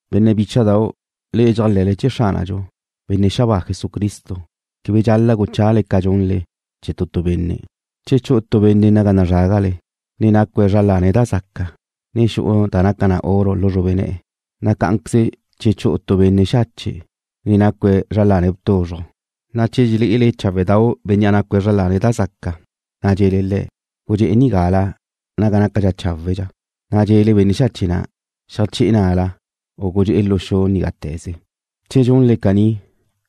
Benne' bícha'dau', le'e dxéajle̱le chee̱ Xránadxu, Benne' xabáa Jesucristo, quebe dxal-la' guchale ca gunle chee̱ tu tu benne'. Che chu'u tu benne' naga nazrágale, ne nácue̱' zra lane̱' da zaca, ne xu'u da naca na oro lu xrube ne̱'e̱, na' cá'anqueze che chu'u tu benne' xache', ne nácue̱' zra lane̱' tuzruj, na' che dxelé'ele cháwedau' bénnea' nácue̱' zra lane̱' da zaca, ne dxe̱le le̱': “Gudxe'e nigala naga nácadxa na chawe'”, na' dxe̱le benne' xache' na': “Xeajsé̱ na'la, u gudxe'e lu xu ná'te̱ze.” Che dxunle caní,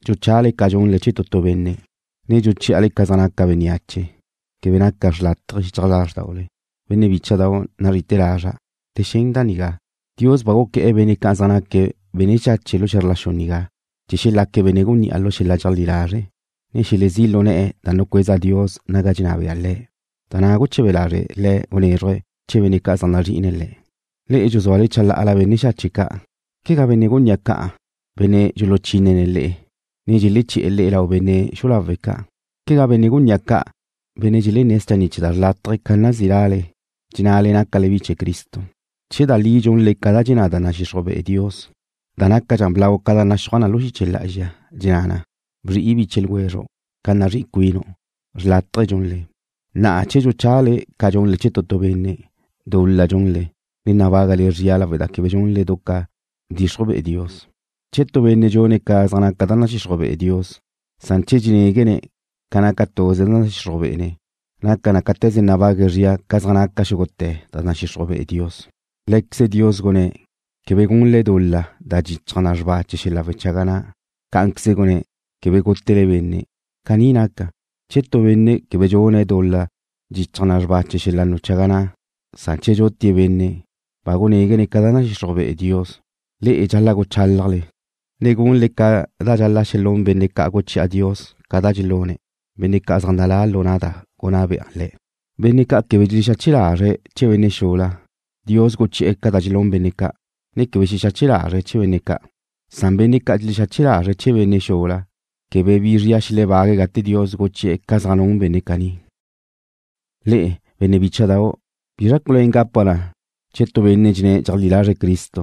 dxuchale ca dxunle chee̱ tu tu benne', ne dxuchí'ale ca zaj naca bénneache, quebe naca xrlátaje xichaj lázrdaule. Benne' bícha'dau' nazri'ite̱ lazra', le xen da nigá: Dios ba guqué̱'e̱ benne' ca' zaj naque̱' benne' xache' lu xe̱zr la xu nigá chee̱ xelaque̱' benne' gunní'a lu xel-la' dxeajlí lazre', ne chee̱ xelezí' lu ne̱'e̱ da nucueza Dios naga dxenná bea Le̱', da na' guche̱be lazre' Le̱' gunézruje̱' chee̱ benne' ca' zaj nazri'ine̱' Le̱'. Le'e dxuzúale chalá'ala benne' xache' ca'. ¿Quegá benne' gunní'a ca' benne' dxuluchínene̱' le'e, ne dxeleché̱'e̱ le'e lau benne' xulawe' ca'? ¿Quegá benne' gunní'a ca' benne' dxelenné̱' schanni' chee̱ da xrlátaje ca nazí' lale, dxennale nácale bi chee̱ Cristo? Che da li dxunle ca dxenná da nadxixruj be'e Dios, da nácadxa blau ca da naxúaj na lu xiche lá'azxa, dxenná na: Bzri'i biche ljwezru' ca nazrí'i cuinu', xrlátaje dxunle. Na'a che dxuchale ca dxunle chee̱ tu tu benne', dul-la dxunle, ne nabágale zria lawe' da quebe dxunle du ca bdxixruj be'e Dios. Che tu benne' dxune̱' ca zaj naca da nadxixruj be'e Dios, san che dxenéguene̱' ca naca tuze da nadxixruj be'ene̱', naca na cáte̱ze nabague̱' zria ca zaj naca xúgute̱ da nadxixruj be'e Dios. Lé̱queze Dios gunné̱': “Quebe gunle dul-la da dxichaj na xrba chee̱ xel-la' wechaga na'”, cá'anqueze gunné̱': “Quebe gútele benne'.” Caní naca, che tu benne' quebe dxune̱' dul-la da dxichaj na xrba chee̱ xel-la' wechaga na', san che dxutie̱' benne', ba gunéguene̱' ca da nadxixruj be'e Dios. Le'e dxal-la' guchálajle, ne gunle ca dxal-la' xelún benne' ca' guchi'a Dios ca da dxelune̱', benne' ca' zaj nalá lu na' da gunná bea Le̱'. Benne' ca' quebe dxelexexache lazre̱' chee̱ benne' xula, Dios guchi'e̱ ca da dxelún benne' ca', ne quebe xexache lazre̱' chee̱ benne' ca', san benne' ca' dxelexexache lazre̱' chee̱ benne' xula quebe bi zria xelebague̱' gate Dios guchi'e̱ ca da zaj nun benne' caní. Le'e, benne' bícha'dau', ¿bizra culuén gapa na che tu benne' dxenné̱' dxeajlí lazre̱' Cristo,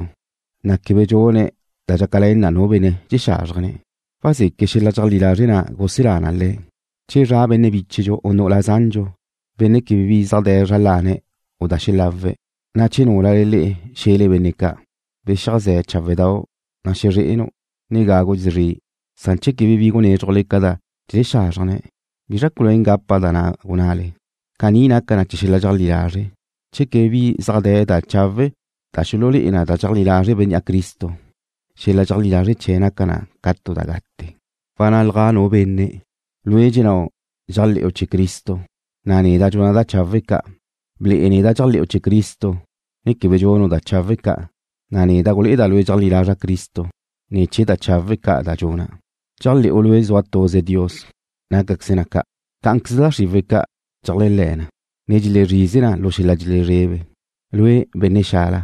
na' quebe bi dxune̱' da dxácale̱n nu benne' dxexázrjene̱'? ¿Wazeque' xel-la' dxeajlí lazre' na' guselá na le̱'? Che zra' benne' bíchedxu u nu'ula zandxu, benne' quebe bi zaj de̱ zra lane̱' u da xelawe̱', na' che núlale le'e xe̱le benne' ca': “Bexiajzé̱ cháwedau'. Nazré'enu', ne gágugu' szri'”, san che quebe bi gunézrujle ca da dxexázrjene̱', ¿bizra culuén gapa da na' gunnále? Caní naca na chee̱ xel-la' dxeajlí lazre'. Che quebe bi zaj de̱ da chawe' da xululé'e na che dxeajlí lazre' bénnea' Cristo, xel-la' dxeajlí lazre' chee̱' naca na ca tu da gate. Wannalja nu benne': Lue' dxennáu' dxéajle̱'u chee̱ Cristo, na' neda' dxuna' da chawe' ca'. Ble'e neda' dxéajle̱'u chee̱ Cristo ne quebe dxunu' da chawe' ca', na' neda' gulé'eda' lue' dxeajlí lazra' Cristo ne̱ chee̱ da chawe' ca' da dxuna'. Dxéajle̱'u lue' zua tuze Dios. Nácaqueze na ca'. Cá'anqueze da xriwe̱' ca' dxeléajle̱ na, ne dxelezrize na lu xel-la' dxelezrebe. Lue', benne' xala,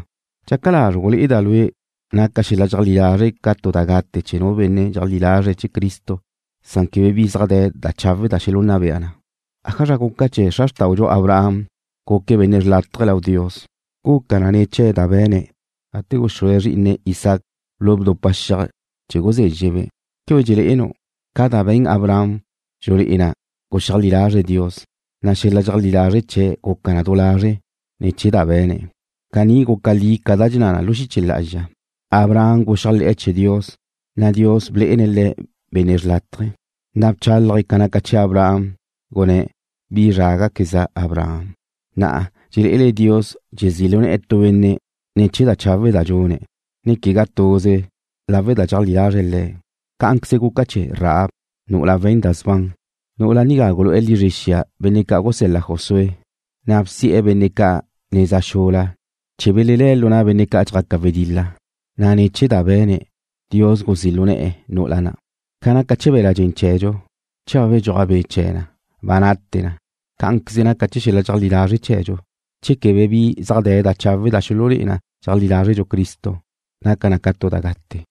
¿dxaca lazru' gulé'eda' lue' naca xel-la' dxeajlí lazre' ca tu da gate che nu benne' dxeajlí lazre̱' Cristo na' quebe bi zaj de̱ da chawe' da xelunna bea na? ¿Ájazra guca chee̱ xra xrtáudxu Abraham guque̱' benne' xrlátaje̱ lau Dios? Guca na ne̱ chee̱ da be̱ne̱' gate guxúe̱' zrí'ine̱' Isaac lu bdupa xiaj chee̱ guzezxe̱'-be'. ¿Quebe dxele'enu'? Ca da be̱n Abraham dxulé'e na guxeajlí lazre̱' Dios, na' xel-la' dxeajlí lazre' chee̱' guca na du lazre' ne̱ chee̱ da be̱ne̱'. Caní guca li ca da dxenná na lu xiche lá'azxa: Abraham guxéajle̱'e̱ chee̱ Dios, na' Dios blé'ene̱' le̱' benne' xrlátaje̱. Na' bchálaje̱' ca naca chee̱ Abraham, gunné̱': “Bi zrágaqueza', Abraham.” Na'a dxelé'ele Dios dxezí' lu ne̱'e̱ tu benne' ne̱ chee̱ da chawe' da dxune̱', ne quegá tuze lawe' da dxeajlí lazre̱' Le̱'. Cá'anqueze guca chee̱ Rahab, nu'ula we̱n da sban. Nu'ula nigá gulu'e̱ lizre̱' benne' ca' gusel-la Josué, na' bsi'e̱ benne' ca' neza xula chee̱ belelé̱' lu na' benne' ca' dxjaque̱' wedil-la, na' ne̱ chee̱ da be̱ne̱', Dios guzí' lu ne̱'e̱ nu'ula na'. Ca naca chee̱ be̱la' dxen chee̱dxu, che ba bedxúaj be' chee̱ na, ba nate na, cá'anqueze naca chee̱ xel-la' dxeajlí lazre' chee̱dxu. Che quebe bi zaj de̱ da chawe' da xululé'e na dxeajlí lazrdxu Cristo, naca na ca tu da gate.